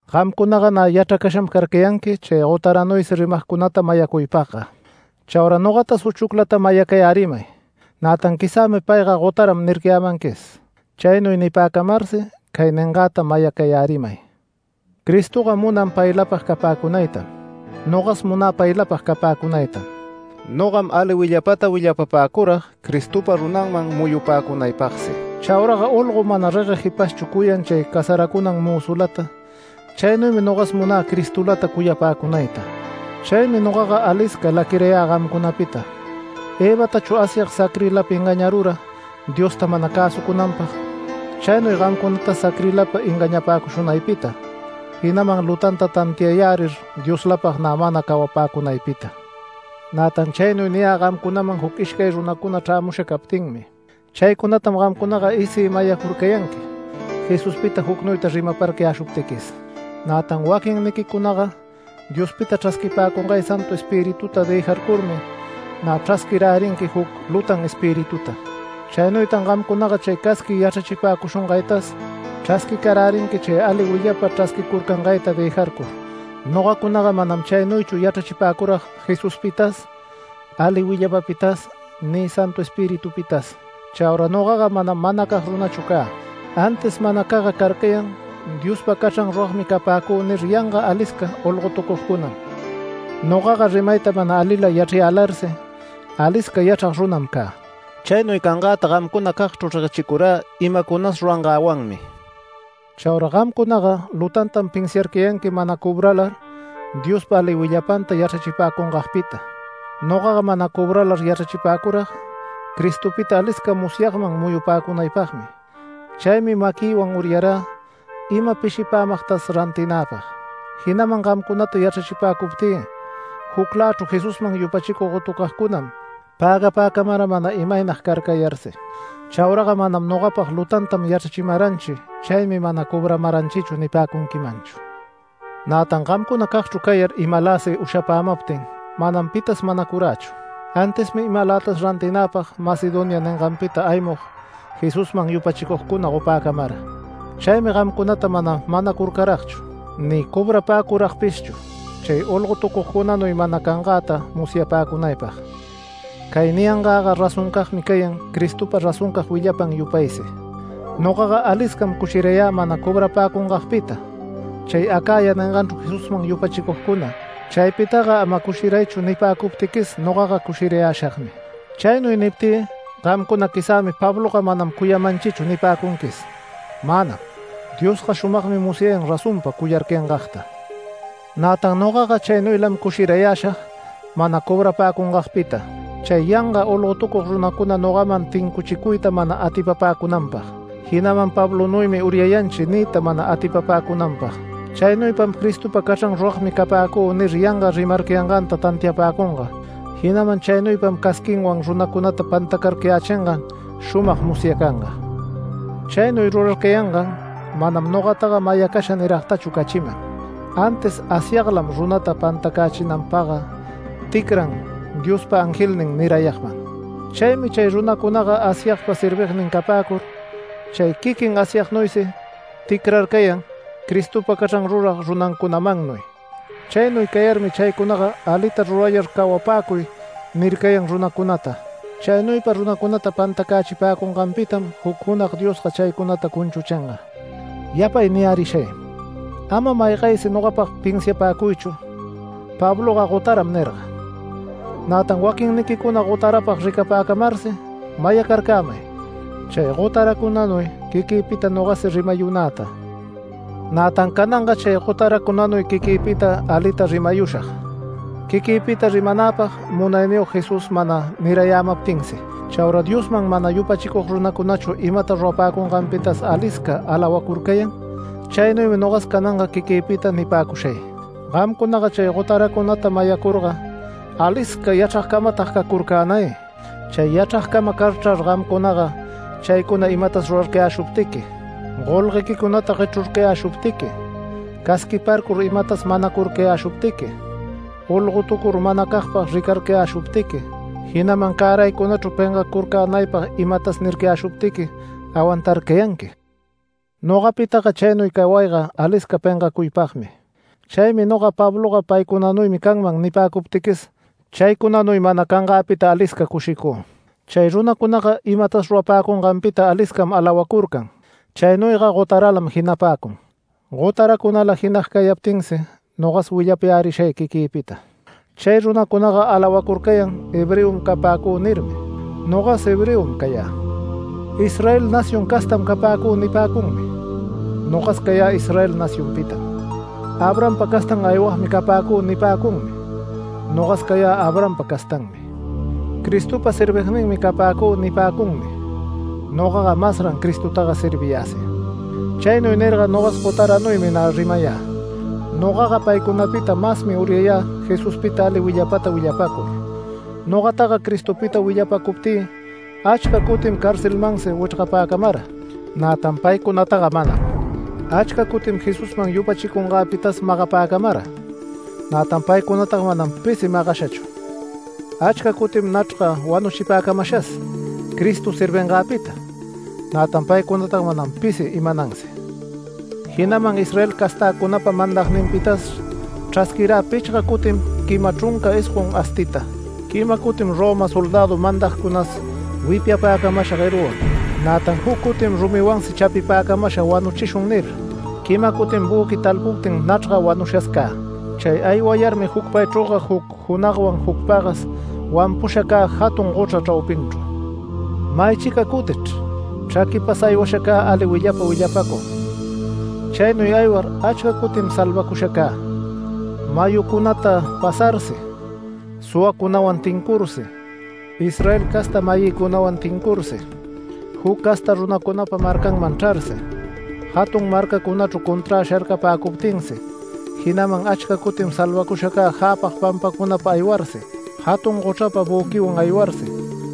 Gamcunaga nä yachracasham carcayanqui chay gotaranuysi rimagcunata mayacuypagga. Chaura nogatas uchuclata mayacayärimay. Nätan “Quizämi payga gotaram” nircayämanquis. Chaynuy nipäcamarsi cay ningäta mayacayärimay. Cristoga munan paylapag capäcunaytam. Nogas munä paylapag capäcunaytam. Nogam ali willapata willapapäcurag Cristopa runanman muyupäcunaypagsi. Chauraga olgo mana regueg jipashchu cuyan chay casaracunan mözulata, chaynuymi nogas munä Cristolata cuyapäcunayta. Chaymi nogaga alisca laquirayä gamcunapita, Evatachu Asyag sacrilapa engañarura Diosta mana cäsucunanpag. Chaynuy gamcunatas sacrilapa engañapäcushunaypita, jinaman lutanta tantiayärir Dioslapag nä mana cawapäcunaypita. Nätan chaynuy niyä gamcunaman juc ishcay runacuna chrämusha captinmi. Chaycunatam gamcunaga isï mayacurcayanqui Jesuspita jucnuyta rimaparcayäshuptiquis. Nätan waquinniquicunaga Diospita chrasquipäcungay Santu Espirituta dëjarcurmi nä chrasquirärinqui juc lutan espirituta. Chaynuytan gamcunaga chay casqui yachrachipäcushungaytas chrasquicarärinqui chay ali willapa chrasquicurcangayta dëjarcur. Nogacunaga manam chaynuychu yachrachipäcurag Jesuspitas, ali willapapitas, ni Santu Espiritupitas. Chaura nogaga manam manacag runachu cä, antis manacagga carcayan “Diospa cachran ruragmi capäcü” nir yanga alisca olgotucugcunam. Nogaga rimayta mana alila yachrayälarsi “Alisca yachrag runam cä”. Chaynuy cangäta gamcunacagchru reguechicurä imacunas rurangäwanmi. Chaura gamcunaga lutantam pinsiarcayanqui mana cobralar Diospa ali willapanta yachrachipäcungagpita. Nogaga mana cobralar yachrachipäcurag Cristopita alisca musyagman muyupäcunaypagmi. Chaymi maquïwan uryarä ima pishipämagtas rantinäpag, jinaman gamcunata yachrachipäcuptï juclächru Jesusman yupachicug gotucagcunam pägapäcamara mana imaynag carcayarsi. Chauraga manam nogapag “Lutantam yachramaranchi, chaymi mana cobramaranchichu” nipäcunquimanchu. Nätan gamcunacagchru cayar imaläsi ushapämaptin manam pitas manacurächu, antismi imalätas rantinäpag Macedonia ninganpita aymug Jesusman yupachicugcuna gopäcamara. Chaymi gamcunata mana manacurcaragchu, ni cobrapäcuragpishchu chay olgotucugcunanuy mana cangäta musyacänaypag. Cay niyangäga razoncagmi cayan Cristopa razoncag willapan yupaysi. Nogaga aliscam cushirayä mana cobrapäcungagpita chay Acaya ninganchru Jesusman yupachicugcuna “Chaypitaga ama cushiraychu” nipäcuptiquis nogaga cushirayäshagmi. Chaynuy niptï gamcuna “Quizämi Pabloga manam cuyamanchichu” nipäcunquis. Manam. Diosga shumagmi musyayan razonpa cuyarcayangagta. Nätan nogaga chaynuylam cushirayäshag mana cobrapäcungagpita, chay yanga olgotucug runacuna nogaman tincuchicuyta mana atipapäcunanpag, jinaman “Pablonuymi uryayanchi” niyta mana atipapäcunanpag. Chaynuypam “Cristopa cachran ruragmi capäcü” nir yanga rimarcayanganta tantiapäcunga, jinaman chaynuypam casquinwan runacunata pantacarcayächingan shumag musyacanga. Chaynuy rurarcayangan manam nogataga mayacasha niragtachu cachiman, antis Asyaglam runata pantacächinanpagga ticran Diospa angelnin nirayagman. Chaymi chay runacunaga Asyagpa servignin capäcur, chay quiquin Asyagnuysi ticrarcayan, Cristopa cachran rurag runacunamannuy. Chaynuy cayarmi chaycunaga “Alita rurayar cawapäcuy” nircayan runacunata. Chaynuypa runacunata pantacächipäcunganpitam juc junag Diosga chaycunata cunchuchinga. Yapay niyärishay: Ama maygaysi nogapag pinsiapäcuychu “Pabloga gotaram” nirga, nätan waquinniquicuna gotarapag ricapäcamarsi mayacarcämay chay gotaracunanuy quiquïpita nogasi rimayunäta. Nätan cananga chay gotaracunanuy quiquïpita alita rimayushag, quiquïpita rimanäpag Munayniyog Jesús mana nirayämaptinsi. Chaura Diosman mana yupachicug runacunachu imata rurapäcunganpitas alisca alawacurcayan, chaynuymi nogas cananga quiquïpita nipäcushay. ¡Gamcunaga chay gotaracunata mayacurga alisca yachragcamatag cacurcänay! Chay yachragcama carchrar gamcunaga chaycuna imatas rurarcayäshuptiqui, golguequicunata guechrurcayäshuptiqui, casquiparcur imatas manacurcayäshuptiqui, olgotucur manacagpag ricarcayäshuptiqui, jinaman cäraycunachru pengacurcänaypag imatas nircayäshuptiqui awantarcayanqui. Nogapitaga chaynuy cawayga alisca pengacuypagmi. Chaymi noga “Pabloga paycunanuymi canman” nipäcuptiquis, chaycunanuy mana cangäpita alisca cushicü. Chay runacunaga imatas rurapäcunganpita aliscam, alawacurcan chaynuyga gotaralam jinapäcun. Gotaracunala jinag cayaptinsi nogas willapayärishay quiquïpita. Chay runacunaga alawacurcayan “Hebreom capäcü” nirmi. Nogas Hebreom cayä. “Israel nación castam capäcü” nipäcunmi, nogas cayä Israel nacionpitam, “Abrahampa castan aywagmi capäcü” nipäcunmi, nogas cayä Abrahampa castanmi. “Cristopa servigninmi capäcü” nipäcunmi, nogaga masran Cristotaga serviyäsi. Chaynuy nirga nogas gotaranuymi nä rimayä. Nogaga paycunapita masmi uryayä Jesuspita ali willapata willapacur. Nogataga Cristopita willapacuptï achca cutim carcelmansi wichrgapäcamara, nätan paycunataga manam. Achca cutim Jesusman yupachicungäpitas magapäcamara, nätan paycunataga manam pisi magashachu. Achca cutim nachrga wanuchipäcamashas Cristo servingäpita, nätan paycunataga manam pisi imanansi. Jinaman Israel castäcunapa mandagninpitas chrasquirä pichga cutim quima chrunca isgon astiyta, quima cutim Roma soldädu mandagcunas wipyapäcamasha gueruwan, nätan juc cutim rumiwansi chapipäcamasha “Wanuchishun” nir, quima cutim büqui talpuptin nachrga wanushas cä. Chay aywayarmi jucpaychrüga juc junagwan juc pagas wanpusha cä jatun gochra chraupinchru. Maychica cutichr chraquipas aywasha cä ali willapa willapacug, chaynuy aywar achca cutim salvacusha cä: mayucunata pasarsi, suwacunawan tincursi, Israel casta-mayïcunawan tincursi, juc casta runacunapa marcaman chrarsi, jatun marcacunachru conträ sharcapäcuptinsi. Jinaman achca cutim salvacusha cä jäpag pampacunapa aywarsi, jatun gochrapa büquiwan aywarsi,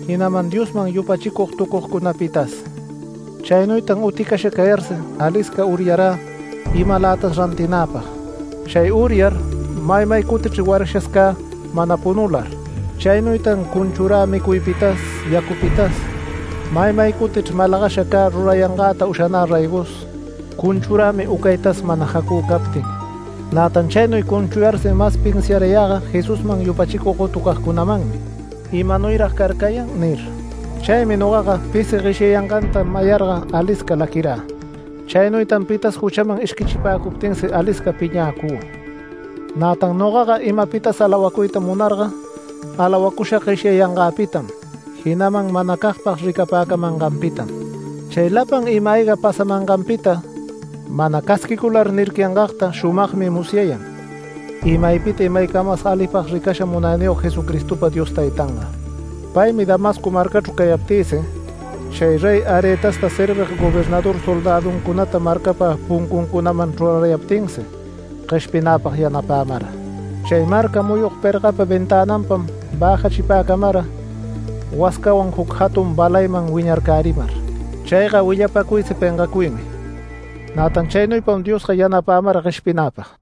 jinaman Diosman yupachicugtucugcunapitas. Chaynuytan uticasha cayarsi alisca uryarä imalätas rantinäpag. Chay uryar maymay cutichr warashas cä mana punular. Chaynuytan cunchurä micuypitas, yacupitas. Maymay cutichr malagasha cä rurayangäta ushanä raygos, cunchurämi ucaytas mana jacü captin. Nätan chaynuy cunchuyarsi mas pinsiarayäga Jesusman yupachicug gotucagcunamanmi “¿Imanuyrag carcayan?” nir. Chaymi nogaga pisi gueshyayanganta mayarga alisca laquirä. Chaynuytan pitas juchaman ishquichipäcuptinsi alisca piñäcü. Nätan nogaga imapitas alawacuyta munarga alawacushag gueshyayangäpitam, jinaman manacagpag ricapäcamanganpitam. Chay lapan ima-ayga pasamanganpita, mana casquicular nircayangagta shumagmi musyayan imaypita imaycamas alipag ricasha Munayniyog Jesucristopa Dios Taytanga. Paymi Damasco marcachru cayaptïsi, chay Rey Aretasta servig gobernador soldäduncunata marcapa puncuncunaman chrurarayaptinsi gueshpinäpag yanapämara chay marca muyug pergapa ventänanpam bäjachipäcamara wascawan juc jatun balayman wiñarcärimar. Chayga willapacuysi pengacuymi. Nätan chaynuypam Diosga yanapämara gueshpinäpag.